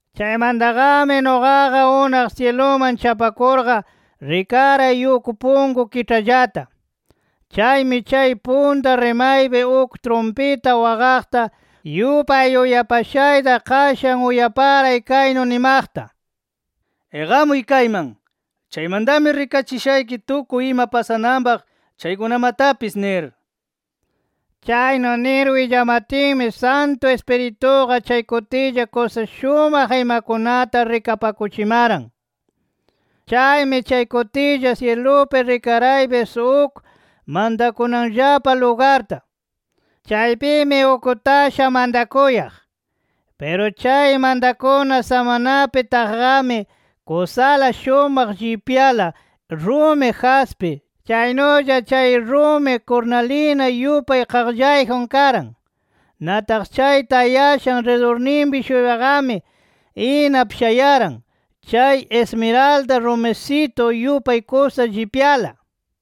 Chaymantaqami nuqaqa unaq syiluman chapakurqa, rikaray uk punku kiĉhallata. Chaymi chay punta rimaypi uk trumpita waqaqta yupay uyapashayta qashan uyaparay kaynu nimaqta: “Iqamuy kayman. Chaymantami rikachishayki tukuy ima pasananpaq chaykunamatapis” nir. Chaynu nir willamatinmi Santu Ispirituqa chay kutilla kusa shumaq imakunata rikapakuchimaran. Chaymi chay kutilla, syilupi rikaraypis uk mantakunanllapa lugarta. Chaypimi uk tasha mantakuyaq. Piru chay mantakuna samanapi taqqami, kusala shumaq llipyala rumi jaspi, chaynulla chay rumi kurnalina yupay qaqllayjun karan. Nataq chay tayashan ridurninpi-shuypaqami, inap shayaran chay ismiralda rumisitu yupay kusa llipyala.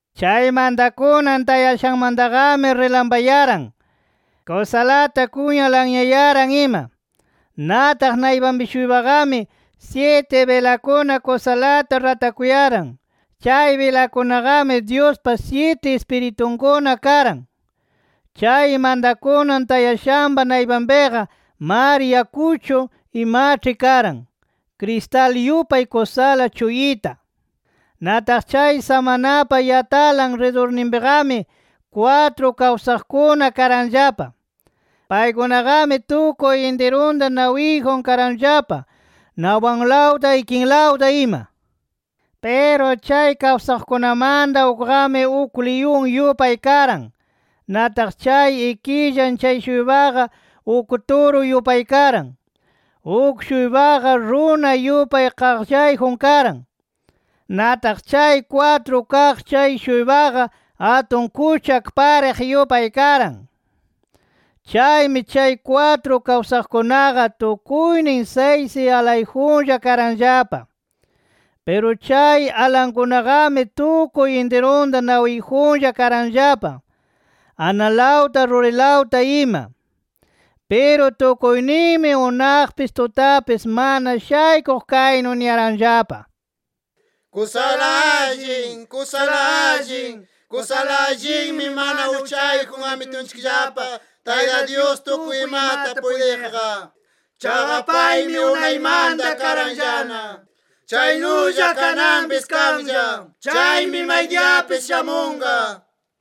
Chay mantakunan tayashanmantaqami rilampayaran, kusalata kunya lanyayaran ima. Nataq naypanpi-shuypaqami, syiti bilakuna kusalata ratakuyaran. Chay bilakunaqami, Dyuspa syiti Ispiritunkuna karan. Chay mantakunan tayashanpa naypanpiqa mar yakuchu imaĉhi karan, kristal yupay kusala chuyita. Nataq chay samanapa yatalan ridurninpiqami, kwatru kawsaqkuna karanllapa. Paykunaqami tukuy intirunta nawiyjun karanllapa, nawpanlawta ikilawta ima. Piru chay kawsaqkunamanta ukqami uk liyun yupay karan. Nataq chay ikillan chay-shuypaqa uk turu yupay karan. Uk-shuypaqa runa yupay qaqllayjun karan. Nataq chay kwatru kaq chay-shuypaqa atun kuchak pariq yupay karan. Chaymi chay kwatru kawsaqkunaqa, tukuynin saysi alayjunlla karanllapa. Piru chay alankunaqami tukuy intirunta nawiyjunlla karanllapa, analawta rurilawta ima. Piru tukuyninmi unaqpis tutapis mana shaykuq kaynu niyaranllapa: “Kusala allin, kusala allin, kusala allinmi mana uchayjun Amitunchikllapa Tayta Dyus tukuy imata puytiqqa. Chaqa paymi unaymanta karanllana. Chaynulla kananpis kanlla. Chaymi maydiyapis shamunqa” nir.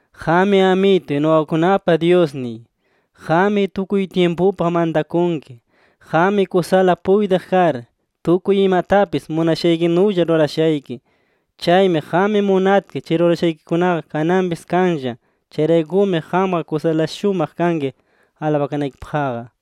“Qammi Amituy, nuqakunapa Dyusniy. Qammi tukuy tyimpupaq mantakunki. Qammi kusala puytiq kar, tukuy imatapis munashaykinulla rurashayki. Chaymi qam munatki chay rurashaykikunaqa kananpis kanlla. Chayraykumi qamqa kusala shumaq kanki alabakanaykipaqqa” nir.